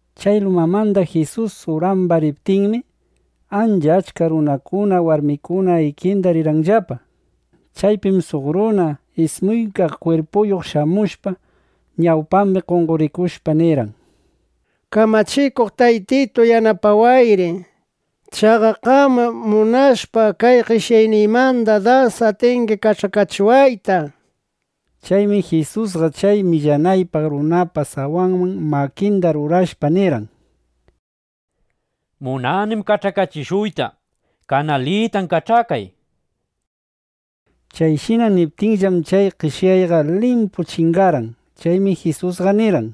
Chay lumamanda Jisus uraman riptinmi, ancha achka runakuna, warmikuna ikinda rirqanllapa. Chaypim suq runa ismuykaq kwirpuyuq shamushpa, ñawpambi qonqorikushpa, nirqan: —Kamachikuq taytitu, yanapawayri. Chaqa qamqam munashpa kay qeshyayniymandaqa das atingi kach'akachiwayta, nishpa. Chaymi Jisusqa chay millanaypaq runapa sawanman makinda rurashpa nirqan: —Munanim kach'akachishuyta. Kanalitan kach'akay, nishpa. Chayshina niptinllam, chay qeshyayqa limpu chingarqan. Chaymi Jisusqa nirqan: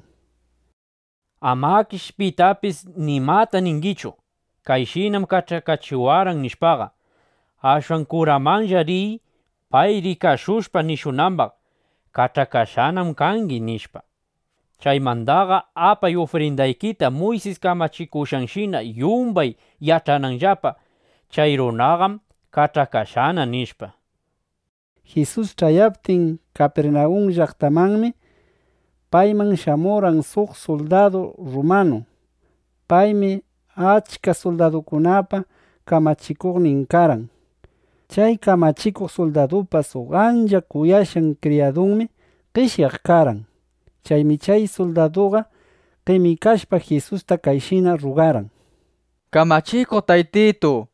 —Amakish pitapis nimata ningichu “Kayshinam kach'akachiwarqan”, nishpaqa. Ashwan kuramanlla riy, pay rikashushpa nishunambaq: “Kach'akashqanam kangi”, nishpa. Chaymandaqa apay ufrindaykita Muysis kamachikushqanshina, yumbay yach'ananllapa: Chay runaqam kach'akashqana, nishpa. Jisus ch'ayaptin Kapirnawun llaqtamanmi, payman shamurqan suq suldadu rrumanu. Paymi achka suldadukunapa kamachikuqnin karqan. Chay kamachikuq suldadupa suq ancha kuyashqan kriyadunmi qeshyaq karqan. Chaymi chay suldaduqa qemikashpa, Jisusta kayshina rruqarqan: —Kamachikuq Taytitu,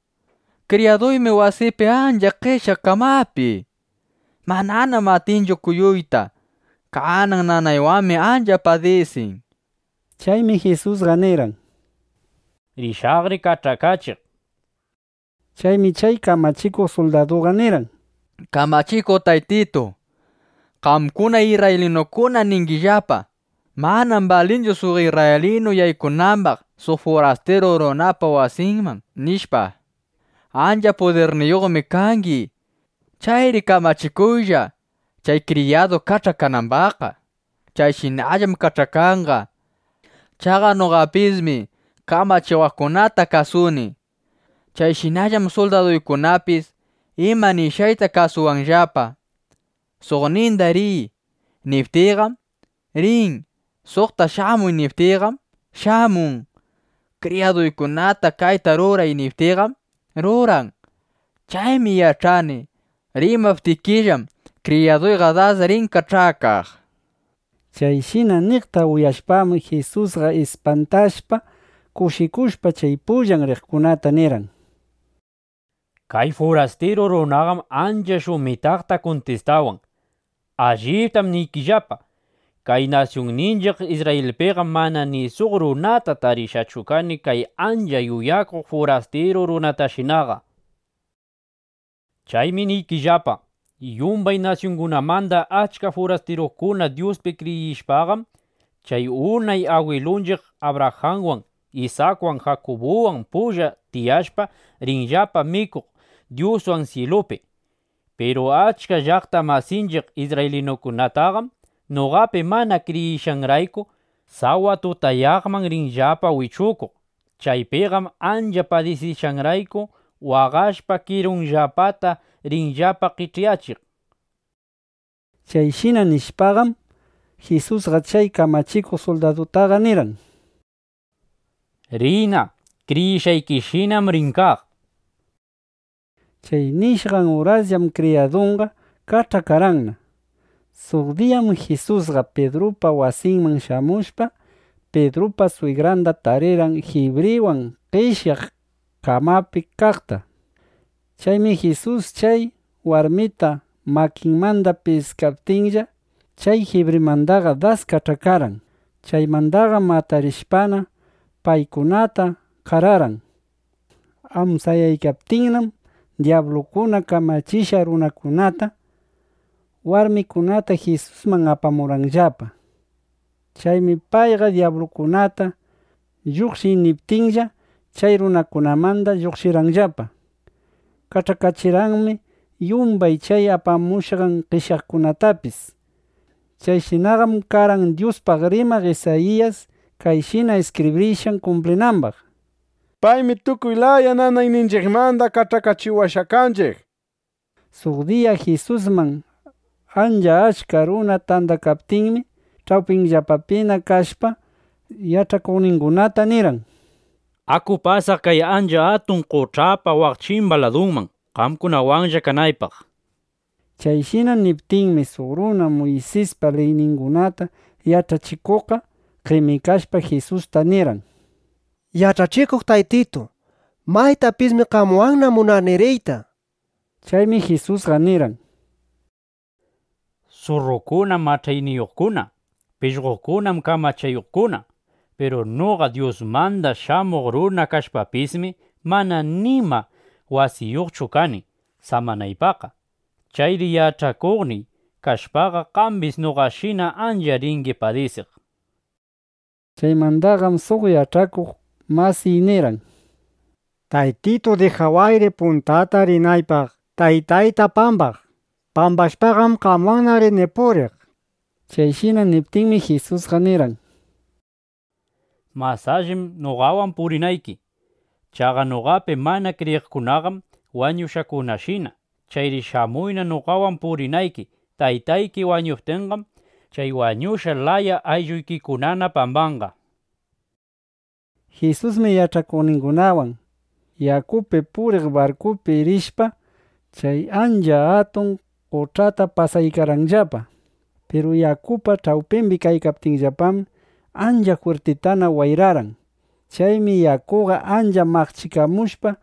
kriyaduymi wasiypi ancha qeshyaq kamapi. Mananam atinchu kuyuyta. Kanan nanaywanmi ancha padisin, nishpa. Chaymi Jisusqa nirqan: —Rishaqri kach'akachiq, nishpa. Chaymi chay kamachikuq suldaduqa nirqan: —Kamachikuq Taytitu, qamkuna isrraylinukuna ningillapa: Manam balinchu suq isrraylinu yaykunambaq suq furastiru runapa wasinman, nishpa. Ancha pudirniyuqmi kangi. Chayri kamachikuylla, chay kriyaduy kach'akanambaqqa. Chayshinallam kach'akanqa. Chaqa noqapismi kamachiwaqkunata kasuni. Chayshinallam suldaduykunapis ima nishqayta kasuwanllapa. Suqninda “riy”, niptiyqam, rin. Suqta “shamuy”, niptiyqam, shamun. Kriyaduykunata “kayta ruray”, niptiyqam, ruran. Chaymi yach'ani: Rimaptikillam, kriyaduyqa das rin kach'akaq, nishpa. Chayshina niqta uyashpaqam, Jisusqa ispantashpa, kushikushpa, chay pullan riqkunata nirqan: —¡Kay furastiru runaqam ancha shumitaqta kuntistawan! ¡Alliptam niykillapa, kay nasyunninchiq Isrrayilpiqam mana ni suq runata tarishqachu kani kay ancha yuyakuq furastiru runatashinaqa! Chaymi niykillapa, yumbay nasyungunamanda achka furastirukuna Dyuspi kriyishpaqam, chay unay agwilunchiq Abrajanwan, Isakwan, Jakubuwan pulla tiyashpa, rinllapa mikuq Dyuswan syilupi. Piru achka llaqta masinchiq isrraylinukunataqam (noqapi mana kriyishqanrayku), sawa tutayaqman rinllapa wichukuq. Chaypiqam ancha padisishqanrayku waqashpa kirunllapata rinllapa qech'yachiq. Chayshina nishpaqam, Jisusqa chay kamachikuq suldadutaqa nirqan: —Riyna. Kriyishqaykishinam rin kaq, nishpa. Chay nishqan urasllam kriyadunqa kach'akarqanna. Suq diyam Jisusqa Pidrupa wasinman shamushpa, Pidrupa swigranda tarirqan jibriwan qeshyaq kamapi kaqta. Chaymi Jisus chay warmita makinmanda piskaptinlla, chay jibrimandaqa das kach'akarqan. Chaymandaqam atarishpana, paykunata qararqan. Amsayaykaptinnam dyablukuna kamachishqan runakunata, warmikunata Jisusman apamurqanllapa. Chaymi payqa dyablukunata “Lluqshiy” niptinlla, chay runakunamanda lluqshirqanllapa. Kach'akachirqanmi yumbay chay apamushqan qeshyaqkunatapis. Chayshinaqam karqan Dyuspaq rimaq Isayiyas kayshina iskibrishqan kumplinambaq: “Paymi tukuy laya nanayninchiqmanda kach'akachiwashqa kanchiq”, nishpa. Suq diya Jisusman ancha achka runa tandakaptinmi, ch'awpinllapapina kashpa, yach'akuqningunata nirqan: —Aku pasaq kay ancha atun qoch'apa waq chimba ladunman, qamkunawanlla kanaypaq, nishpa. Chayshina niptinmi, suq runa Muysispa liyningunata yach'achikuqqa qemikashpa, Jisusta nirqan: —Yach'achikuq Taytitu, maytapismi qamwanna munani riyta, nishpa. Chaymi Jisusqa nirqan: —Surrukunam mach'ayniyuqkuna. Pishqokunam kamachayuqkuna. Piru noqa Dyusmanda shamuq runa kashpapismi, mana nima wasiyuqchu kani samanaypaqqa. (Chayri yach'akuqniy kashpaqa, qambis noqashina ancha ringi padisiq.) Chaymandaqam suq yach'akuq masiy nirqan: —Taytitu, dijawayri puntata rinaypaq taytayta pambaq. Pambashpaqam qamwanna rini puriq, nishpa. Chayshina niptinmi, Jisusqa nirqan: —Mas allim noqawan purinayki. Chaqa noqapi mana kriyiqkunaqam wañushqakunashina. Chayri shamuyna noqawan purinayki. Taytayki wañuptinqam, chay wañushqa laya aylluykikunana pambanqa, nishpa. Jisusmi yach'akuqningunawan yakupi puriq barkupi rishpa, chay ancha atun qoch'ata pasaykarqanllapa. Piru yakupa ch'awpimbi kaykaptinllapam, ancha jwirtitana wayrarqan. Chaymi yakuqa ancha maqchikamushpa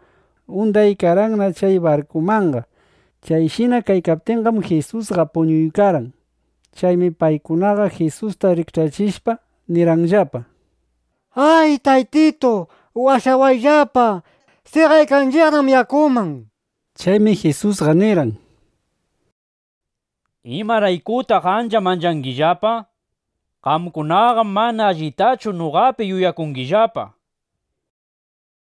undaykarqanna chay barkumanqa. Chayshina kaykaptinqam, Jisusqa puñuykarqan. Chaymi paykunaqa Jisusta rikch'achishpa, nirqanllapa: —¡Ay, Taytitu, washawayllapa! ¡Seqaykanchiqnam yakuman! nishpa. Chaymi Jisusqa nirqan: —¿Imaraykutaq ancha manchangillapa? Qamkunaqam mana allitachu noqapi yuyakungillapa.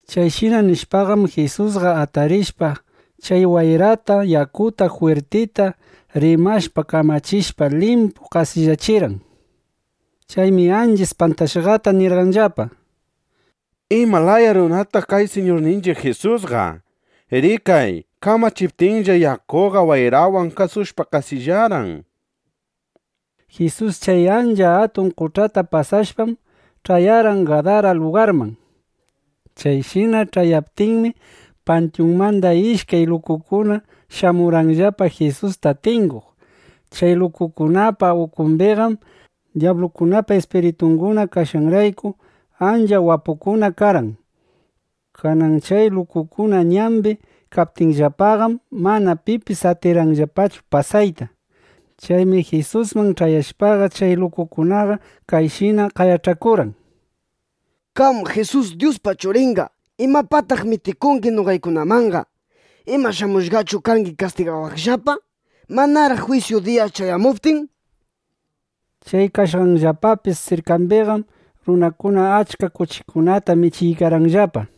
Chayshina nishpaqam, Jisusqa atarishpa, chay wayrata yakuta jwirtita rimashpa, kamachishpa, limpu qasillachirqan. Chaymi ancha ispantashqata nirqanllapa: —¿Ima laya runataq kay Siñurninchiq Jisusqa? Rikay, kamachiptinlla, yakuqa wayrawan kasushpa qasillarqan, nishpa. Jisus chay ancha atun qoch'ata pasashpam, ch'ayarqan Gadara lugarman. Chayshina ch'ayaptinmi, pantyunmanda ishkay lukukuna shamurqanllapa Jisusta tinguq. Chay lukukunapa ukumbiqam dyablukunapa ispiritunguna kashqanrayku, ancha wapukuna karqan. Kanan chay lukukuna ñambi kaptinllapaqam, mana pipis atirqanllapachu pasayta. Chaymi Jisusman ch'ayashpaqa, chay lukukunaqa kayshina qayach'akurqan: —Qam Jisus Dyuspa Churinqa, ¿imapaqtaq mitikungi noqaykunamanqa? ¿Ima shamushqachu kangi kastigawaqllapa, manaraq jwisyu diya ch'ayamuptin? nishpa. Chay kaykashqanllapa sirkambiqam runakuna achka kuchikunata michiykarqanllapa.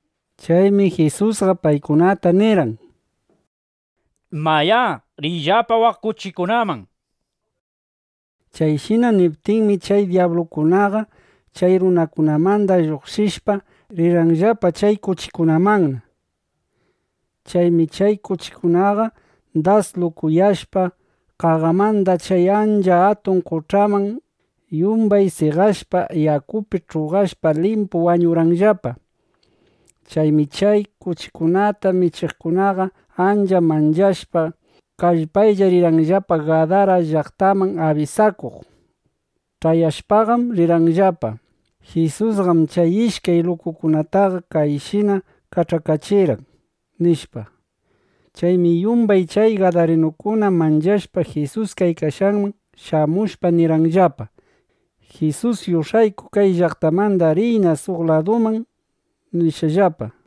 Chaymi Jisusqa paykunata nirqan: —Mayá, riyllapa waq kuchikunaman, nishpa. Chayshina niptinmi, chay dyablukunaqa chay runakunamanda lluqshishpa, rirqanllapa chay kuchikunamanna. Chaymi chay kuchikunaqa das lukuyashpa, qaqamanda chay ancha atun qoch'aman yumbay seqashpa, yakupi ch'uqashpa, limpu wañurqanllapa. Chaymi chay kuchikunata michiqkunaqa ancha manchashpa, kallpaylla rirqanllapa Gadara llaqtaman abisakuq. Ch'ayashpaqam nirqanllapa: —Jisusqam chay ishkay lukukunataqa kayshina kach'akachirqan, nishpa. Chaymi yumbay chay gadarinukuna manchashpa, Jisus kaykashqanman shamushpa nirqanllapa: —Jisus, yush'ayku kay llaqtamandaqa riyna suq laduman, nishpallapa.